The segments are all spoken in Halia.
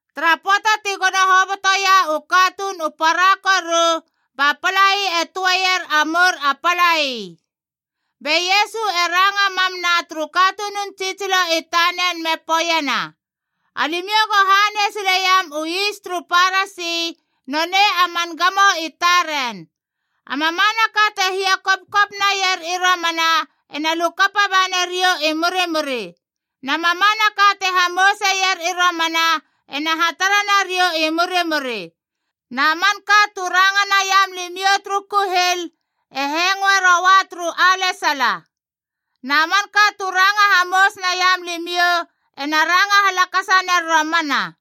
Tara pöata ti gono hobotoia u katuun u para koru, ba palai e töeier a mour a palai. Be Iesu e ranga mam na turu katunun tsitsilo i tanen me poeiena, “Alimiou go hanei sileiam u is turu Parasi, nonei a man gamo i taren. A mamanaka te hia kopkop naier i romana ena lukapa banariou i murimuri. Na mamanaka te hamouseier i romana ena hatara nariou i murimuri. Na manka tu ranga naiam limiou turu kuhil e hengoe roua turu alesala. Na manka tu ranga hamous naiam limiou ena ranga halakasa ner romana.”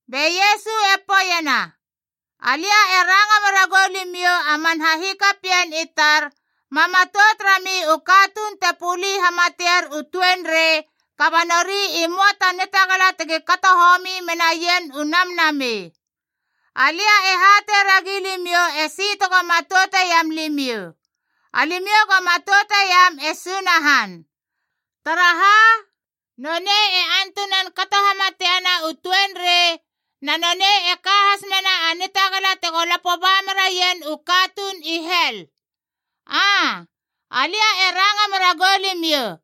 Be Iesu e poeiena, “Alia e ranga mera goulimiou a man hahikapien i tar, ma matout rami u katuun te puli hamatier u tuenrei kaba nori i möa ta nitagala tegi kato homi menaien u namnamei. Alia e hatei ragi limiou esi tego matouteiam limiou: alimiou go matouteiam e Sunahan. Taraha? Nonei e antunan kato hamatiena u tuenrei, na nonei e ka has mena a nitagala tego lapo ba meraien u katuun i hel! Aa, alia e ranga mera goulimiou,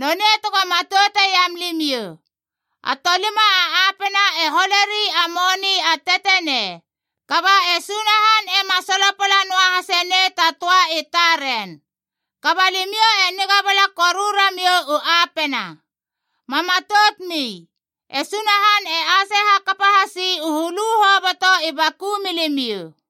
nonei tego matouteiam limiou! A tolima a apena e holeri a moni a tetenei. Kaba e Sunahan ema solopala noa hase nei ta töa i taren. Kaba limiou e niga bala koru ramiou u apena. Ma matoutmi. E Sunahan e ase hakapa hasi u hulu hoboto i baku milimiou.”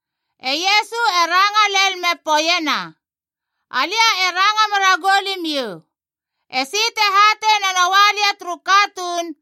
E Iesu e ranga lel me poeiena, “Alia e ranga mera goulimiou: esi te hatei na noa lia turu katuun,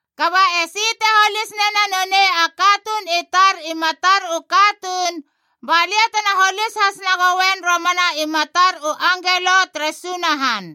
Kaba esi te holis nena nonei a katuun i tar i matar u katuun, balia tena holis has nagoen romana i matar u angelo tere Sunahan.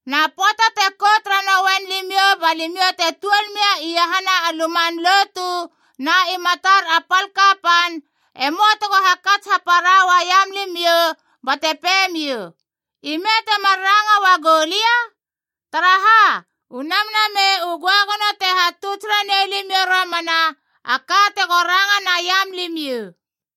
Na pöata te kout raroen limiou ba limiou te tuol mia iahana u luman lotu na i matar a pal kapan, e möa tego hakats hapara uaiam limiou bate pei miou, ‘Ime temar ranga uagou lia?’ Taraha? U Namnamei u Göagono te hatuts ranei limiou romana a ka tego ranga naiam limiou.”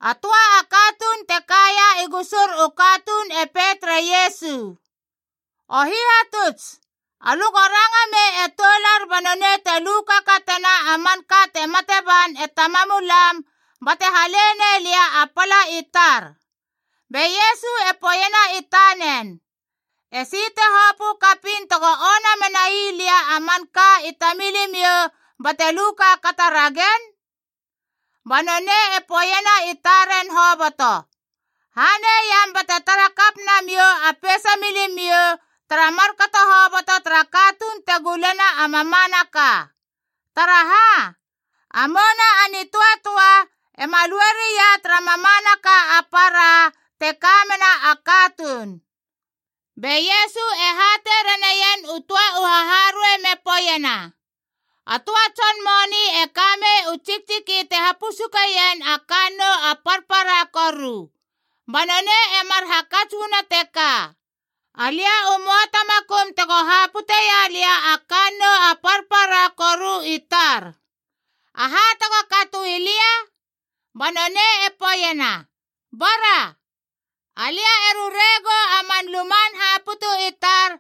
A töa a katuun te kaia i gusur u katuun e pei tere Iesu, “O Hihatuts, alö go ranga mei e toular ba nonei te lu kakatena a manka te mate ban e tamamulam bate hale nei lia a pala i tar.” Be Iesu e poeiena i tanen, “Esi te hopö kapiin tego ona menai lia a manka i tamilimiou bate lu kaakata ragen?” Ba nonei e poeiena i taren hoboto, “Hanei iam bate taratara kap namiou a peisa milimiou tara markato hoboto tara katuun te gulena a mamanaka. Taraha? A mouna a nitöatöa ema lue ria tara mamanaka a para te ka mena a katuun.” Be Iesu e hatei raneien u töa u haharuei me poeiena, “A töa tson moni e ka mei u tsiktsiki te hapusukeien a kannou a parpara koru. Ba nonei e mar hakats uana teka: ‘Alia u möa ta makum tego haputeia lia a kannou a parpara koru i tar. Aha tego katoi lia?’ Ba nonei e poeiena, ‘Bara, alia e rure gou a man luman haputu i tar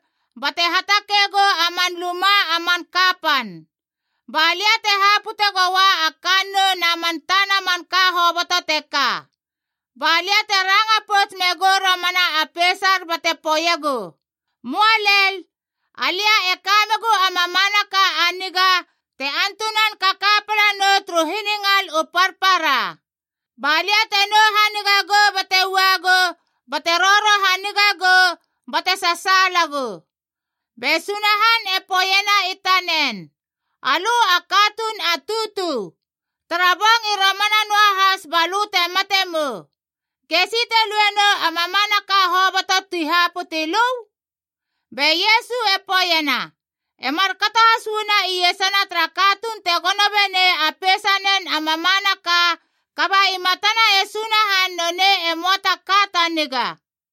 bate hatakei gou a man luma a man kapan. Ba lia te hapute goua a kannou na man tana manka hoboto teka. Ba lia te ranga pouts megou romana a peisar bate poeiegu, Möa lel! Alia e ka megu a mamanaka a niga te antunan kaka pala nou turu hiningal u parpara. Balia te nou haniga gou bate uagu, bate roro haniga gou bate sasaalagu.’ Be Sunahan e poeiena i tanen, ‘Alö a katuun a tutu! Tara bong i romana noahas ba lö te mate mou! Gesi te lue nou a mamanaka hoboto ti haputi lö?’” Be Iesu e poeiena, “E markato has uana iesana tara katuun te gono benei a peisanen a mamanaka, kaba i matana e Sunahan nonei e möa ta ka ta niga.”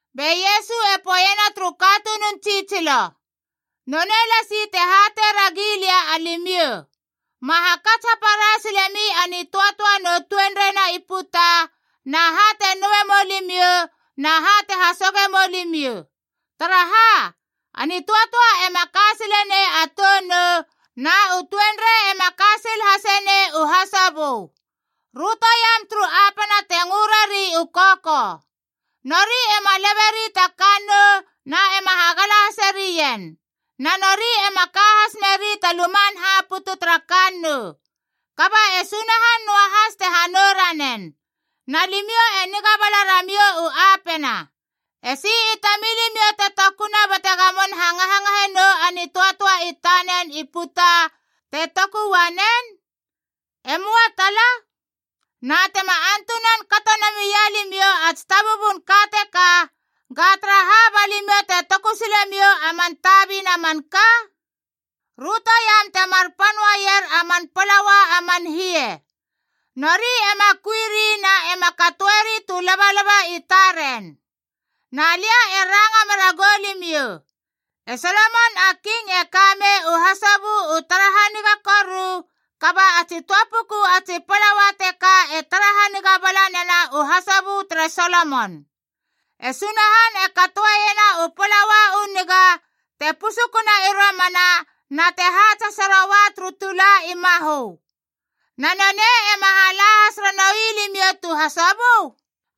Be Iesu e poeiena turu katunun tsitsilo, “Nonei lasi te hatei ragi lia alimiou: ma hakats hapara silemi a nitöatöa nu tuenrei na i puta, na ha te noue mou limiou na ha te hasoge mou limiou. Taraha? A nitöatöa ema ka sile nei a tou nou, na u tuenrei ema ka sil hase nei u hasobö. Rötoiam turu apena te ngö rari u kokou. Nori ema leberi a kannou na ema hagala hase rien, na nori ema ka has meri ta luman haputu tara kannou. Kaba e Sunahan noahas te hanou ranen! Na limiou e niga bala ramiou u apena! Esi i tamilimiou te tokuna bate gamon hangahangahe nou a nitöatöa i tanen i puta te toku uanen? E möa tala. Na tema antunan kato namia limiou a tsitabubun ka teka, ga taraha ba limiou te toku sile miou a man tabina manka? “Rötoiam temar pan uaier a man palaua a man hie. Nori ema kuiri na ema katoeri tu labalaba i taren. Na lia e ranga mera goulimiou, e Solomon a King e ka mei u hasobö u tara haniga koru, kaba a tsi töa puku a tsi plaua teka e tara haniga bala nena u hasobö tere Solomon. E Sunahan e katoeiena u palaua u niga, te pusukuna i romana na te haats hase roua turu tula i mahö. Na nonei ema hala has ranoui limiou tu hasobö?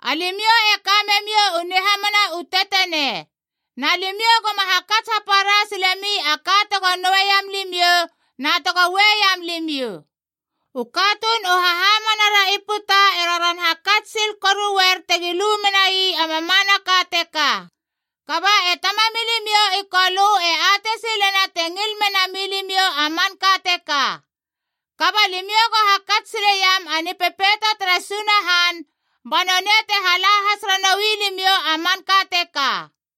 Alimiou e ka memiou u nihamana u tetenei. Na limiou goma hakats hapara silemi a ka tego noueiam limiou na tego ueiam limiou. U katuun u hahamana ra i puta e roron hakats sil koruer tegi lu menai a mamanaka teka. Kaba e Tamamilimiou i Kolö e atei silena te ngil mena milimiou a manka teka. Kaba limiou go hakats sileiam a Nipepeito tere Sunahan, ba nonei te hala has ranoui limiou a manka teka.”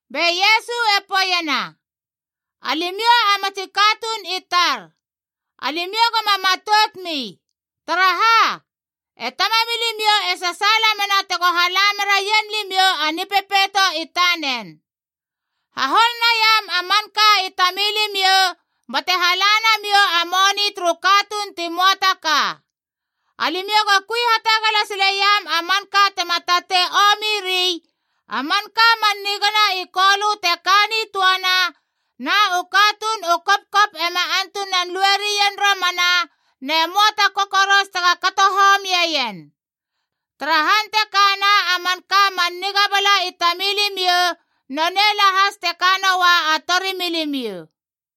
Be Iesu e poeiena, “Alimiou a matsi katuun i tar, alimiou goma matout mi. Taraha? E Tamamilimiou e sasaala mena tego hala meraien limiou a Nipepeito i tanen. Hahol naiam a manka i tamilimiou bate hala namiou a moni turu katuun ti möa ta ka. Alimiou go kui hatagala sileiam a manka tema tatei omiri, a manka man niga na i Kolö te ka nitöana, na u katuun u kopkop ema antunan lue rien romana, ne möa ta kokoros tega kato homieien. Tara han te kana a manka man niga bala i tamilimiou, nonei lahas te ka noa a torimilimiou.”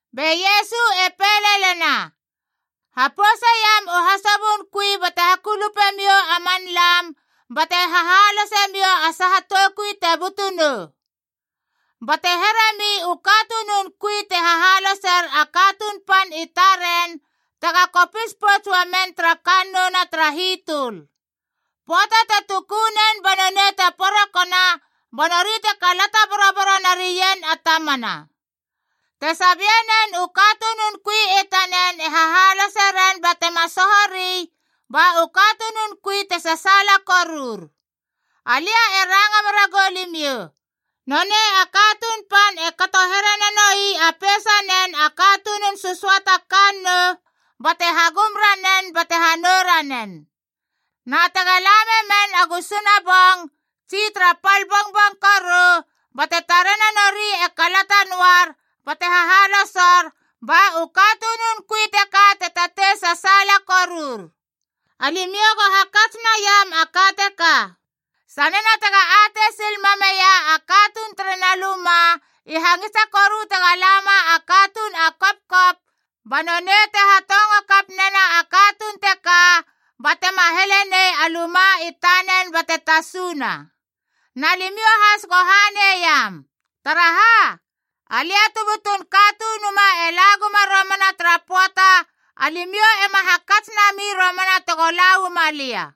Be Iesu e pei lelena, “Hapouseiam u hasobön kui bate hakulupe miou a man lam bate hahalose miou a saha toukui te butu nou. Bate heremi u katunun kui te hahaloser a katuun pan i taren tega kopis pouts uamen tara kannouna tara hitöl. Pöata te tuku nen ba nonei te porokona, ba nori te kalata boroboro narien a tamana. Te sabie nen u katunun kui i tanen e hahalose ren bate ma sohori, ba u katunun kui te sasaala korur. Alia e ranga mera goulimiou, nonei a katuun pan e kato here nanoi a peisanen a katunun sösöata kannou, bate hagum ranen bate hanou ranen. Na tega la memen a gusuna bong, tsi tara pal bongbong koru, bate tarena nori e kalata noar bate hahalosor, ba u katunun kui teka te tatei sasaala korur. Alimiou go hakats naiam a ka teka: Sanena tega atei sil mameia a katuun terena luma i hangisa koru tega lama a katuun a kopkop, ba nonei te hatongo kap nena a katuun teka bate ma heleie nei a luma i tanen bate tasuna. Na limiou has go hanei iam. Taraha? Alia tu butun Katunuma e la guma romana tara pöata alimiou ema hakats nami romana tego la uama lia.”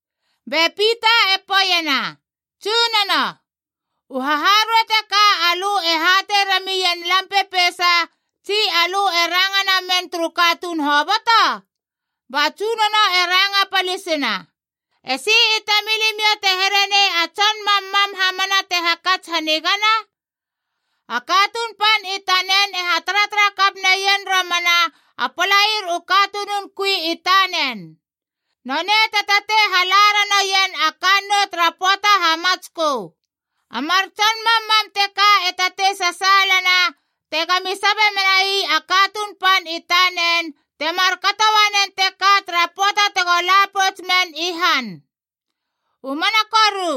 Be Pita e poeiena, “Tsunono, u haharuei teka alö e hatei ramien lam pepeisa, tsi alö e ranga na mien turu katuun hoboto?” Ba Tsunono e ranga palisina, “Esi i tamilimiou te here nei a tson mammam hamana te hakats hanigana? A katuun pan i tanen e hataratara kap naneien romana a palair u katunun kui i tanen. Nonei te tatei hala ranoien a kannou tara pöata hamatskö. A mar tson mammam teka e tatei sasaalana tega mi sabe menai a katuun pan i tanen te markato uanen teka tara pöata tego la pouts men i han. U mana koru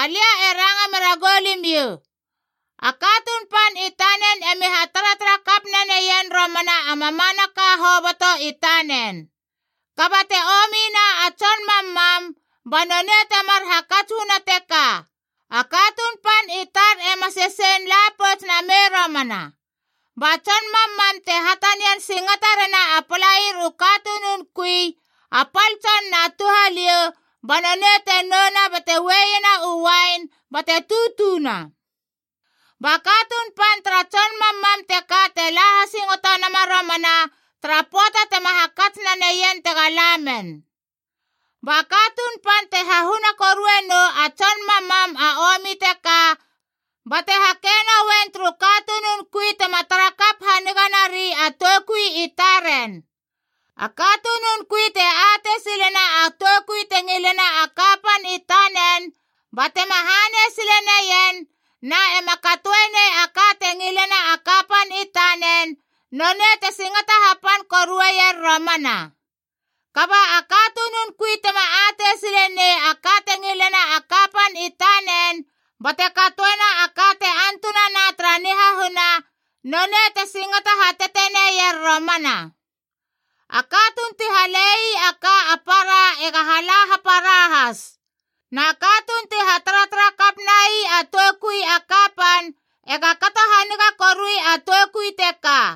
alia e ranga mera goulimiou, a katuun pan i tanen emi hataratara kap naneien romana a mamanaka hoboto i tanen. Kaba te omina a tson mammam, ba nonei temar hakats uana teka, ‘A katuun pan i tar ema sesein la pouts namei romana.’ Ba tson mammam te hatanian singata rena a palair u katunun kui, a pal tson na touhaliou, ba nonei te nouna bate ueiena u uain bate tutuna. Ba katuun pan tara tson mammam teka te la hasingoto nama romana tara pöata tema hakats naneien tega lamen. Ba katuun pan te hahuna korue nou a tson mammam a omi teka bate hake noen turu katunun kui tema tara kap haniga nari a toukui i taren. “A katunun kui te atei silena a toukui te ngilena a kapan i tanen batema hanei sile neien, na ema katoe nei a ka te ngilena a kapan i tanen, nonei te singata hapan koruier romana. Kaba a katunun kui tema atei sile nei a ka te ngilena a kapan i tanen, bate katoena a ka te antunana tara nihahuna, nonei te singata hateteneier romana. A katuun ti hale ii a ka a para ega hala hapara has. Na katuun ti hataratara kap nai a toukui a kapan e ga kato haniga korui a toukui teka.”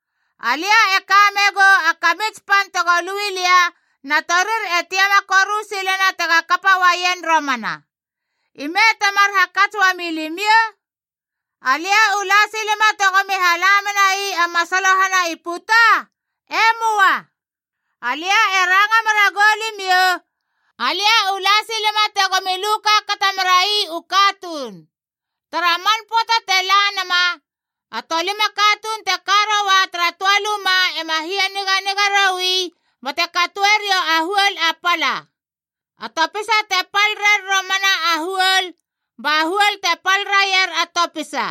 Alia e ka megou a kamits pan tego lui lia, na torir e tiama koru silena tega kapa uaien romana. Ime temar hakats uami limiou? Alia u la silema tegomi hala menai a masalohana i puta? E möa. Alia e ranga mera goulimiou, alia u la silema tegomi lu kaakata merai u katuun! Tara man pöata te la nama, a tolima katuun te ka roua tara töa luma e ma hianiganiga roui bate katoeriou a huol a pala. A topisa te pal rer romana a huol, ba huol te pal raier a topisa.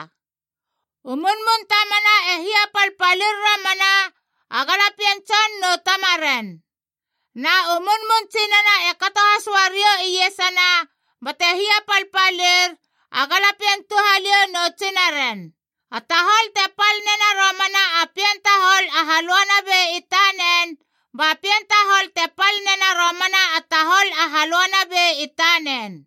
U munmun tamana e hiapalpalir romana, a galapien tson nu tamaren. Na u munmun tsinana e kato has uariou iesana bate hiapalpalir, a galapien touhaliou nu tsinaren. A tahol te pal nena romana a pien tahol a halöanabei i tanen, ba pien tahol te pal nena romana a tahol a halöanabei i tanen.”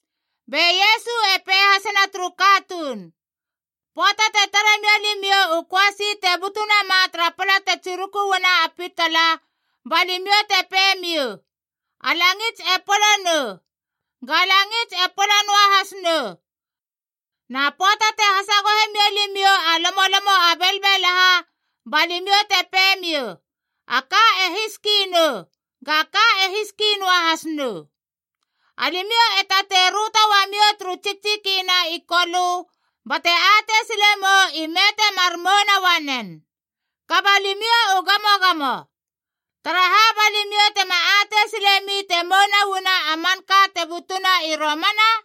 Be Iesu e pei hasena turu katuun, “Pöata te tare mia limiou u köasi te butu nama tara pala te tsiruku uana a pitala, ba limiou te pei miou, ‘A langits e polo nou,’ ga langits e polo noahas nou. Na pöata te hasagohe mia limiou a lomolomo a belbelaha, ba limiou te pei miou, ‘A ka e hiski nou,’ ga ka e hiski noahas nou. Alimiou e tatei röto uamiou turu tsiktsiki na i kolö bate atei sile mou ime te mar mouna uanen. Kaba limiou u gamogamo! Taraha ba limiou tema atei silemi te mouna uana a manka te butuna i romana?”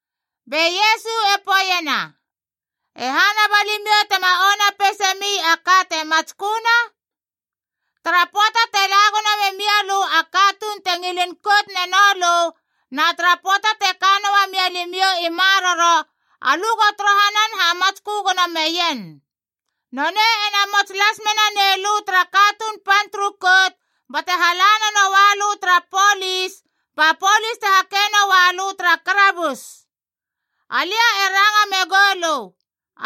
Be Iesu e poeiena, “E hana ba limiou tema ona peisemi a ka te matsköna? Tara pöata te la gono memia lö a katuun te ngilin kout neno lö, na tara pöata te ka noa mia limiou i maroro, alö go torohanan hamatskö gono meien. Nonei e namots las mena nei lö tara katuun pan turu kout bate hala nanoua lö tara polis, ba polis te hake noua lö tara karabus. Alia e ranga megou lö,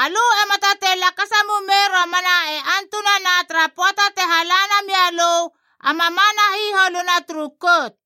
alö ema tatei lakasa mumei romana e antunana tara pöata te hala namia lö a mamana hiholuna turu kout.”